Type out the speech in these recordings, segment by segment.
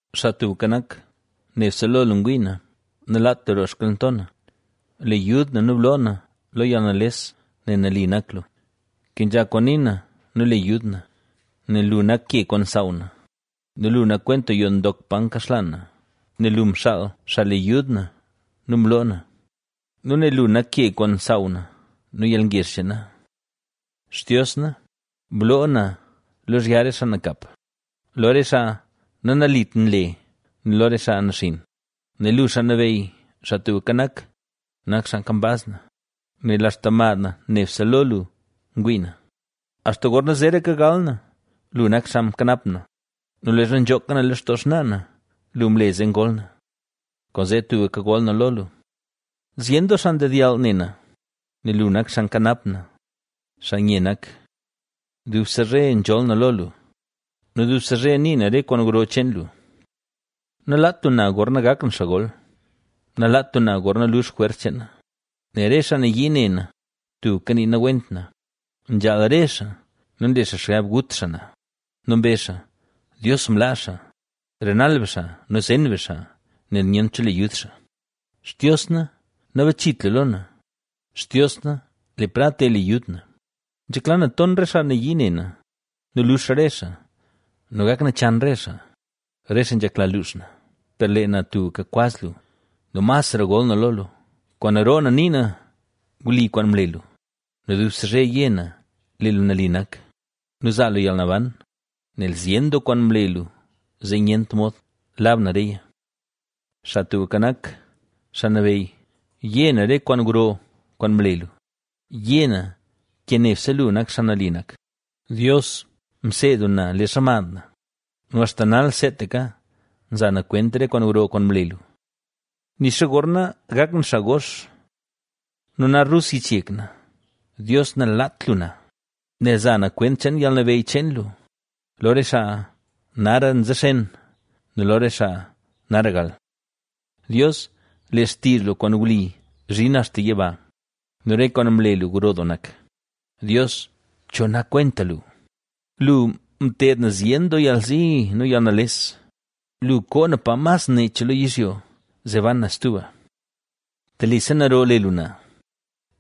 Xaa Tubka Nak, nebse lo lu ngwii na, ¡Nalaat lu roo xkalnto na! ¡Le yud na nu bloo na lo yalnales nel nali nak lu! Kenzha kwaan nii na nu le yud na. Nel lu nak ke kwaan nsaaw na nu lu nak kwenta yoo ndok pa nkaxlaan na; nel lu mxaal xaa le yud na nu mloo na nu nel lu nak ke kwaan nsaaw na nu yalngezh cheen na. Xtios na, bloo na lozhya re xaa nakap, lo re xaa nanalit nle nu lo re xaa naxinn, nel lu, Xaa Nabeyy, Xaa Tubka Nak, nak xaa kambaz na, nel axta mad na nebse lo lu ngwii na, Axta gorna zeraka gal na, lu nak xaa mkanap na nu leezha nzhooka na lextoo xnaa na, lu mle zee ngol na. Kwaanzee tubka gol na lo lu. Zyen doo xaa ndedyall ne na, nel lu nak xaa nkanap na, xaa nye nak. Dubse zhe nzholl na lo lu nu dubse zhe nii na re kwaan gro cheen lu. Nalaat lu na gorna gak na xaa gol; nalaat lu na gorna lux jwers cheen na, nel re xaa nayii ne na, tubka nii nawent na, nzhaal re xaa nu nle xaa xgab gut xaa na. Nu mbezh xaa: “Dios mlaa xaa; renal be xaa nu zen be xaa, nel nyent cho le yud xaa.” ¡Xtios na, nabachit lu lo na, Xtios na, le prad, te le yud na! ¡Nzhekla na ton re xaa nayii ne na nu lux re xaa nu gak nachan re xaa, re xaa nzhekla luux na! Per lee na tubka kwaz lu nu masra gol na lo lu. Kwaan roo na nii na wli kwaan mle lu, nu dubse zhe yé na lee lu nali nak, nu nzaa lu yalnaban, nel zyen doo kwaan mle lu zee nyent mod lab na reya. Xaa Tubka Nak, Xaa Nabeyy, yé na re kwaan gro, kwaan mle lu; ¡yé na ke nebse lu nak xaa nali nak! Dios, mseed lu na leezha mad na nu axta nal seetaka nza na kwent re kwaan gro kwaan mle lu. Nixa gorna gak na xaa gox nu na rus yich yek na, Dios, nalaat lu na, nel za na kwent cheen yalnabeyy cheen lu, lo re xaa nara nzexen nu lo re xaa nara gal. Dios, lee xtizh lu kwaan wli nzhin axta yiba nu re kwaan mle lu gro doo nak; Dios, ¿Cho nak kwenta lu? Lu, mted na zyen doo yalzi nu yalnales, lu, koo na pa mas nech lo yizhyo zee ban na stuba. Telise naro le lu na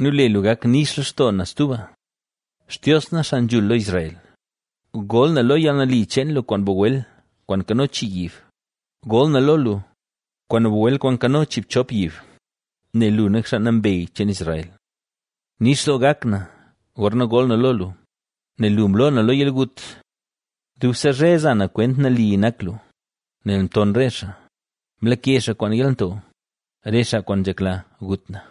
nu le lu gak nix lextoo na stuba. Xtios na, Xaa Nzhul lo Israel, gol na lo yalnali cheen lu kwaan bagwel kwaan nkano chii yib, gol na lo lu, kwaan bagwel kwaan nkano chiibchop yib, nel lu nak xaa nambey cheen Israel. Nix doo gak na, gorna gol na lo lu, nel lu mloo na lo yalgut. Dubse zhe za na kwent nali nak lu, nel mton re xaa, mlake xaa kwaan yalnto, re xaa kwaan nzhekla gut na.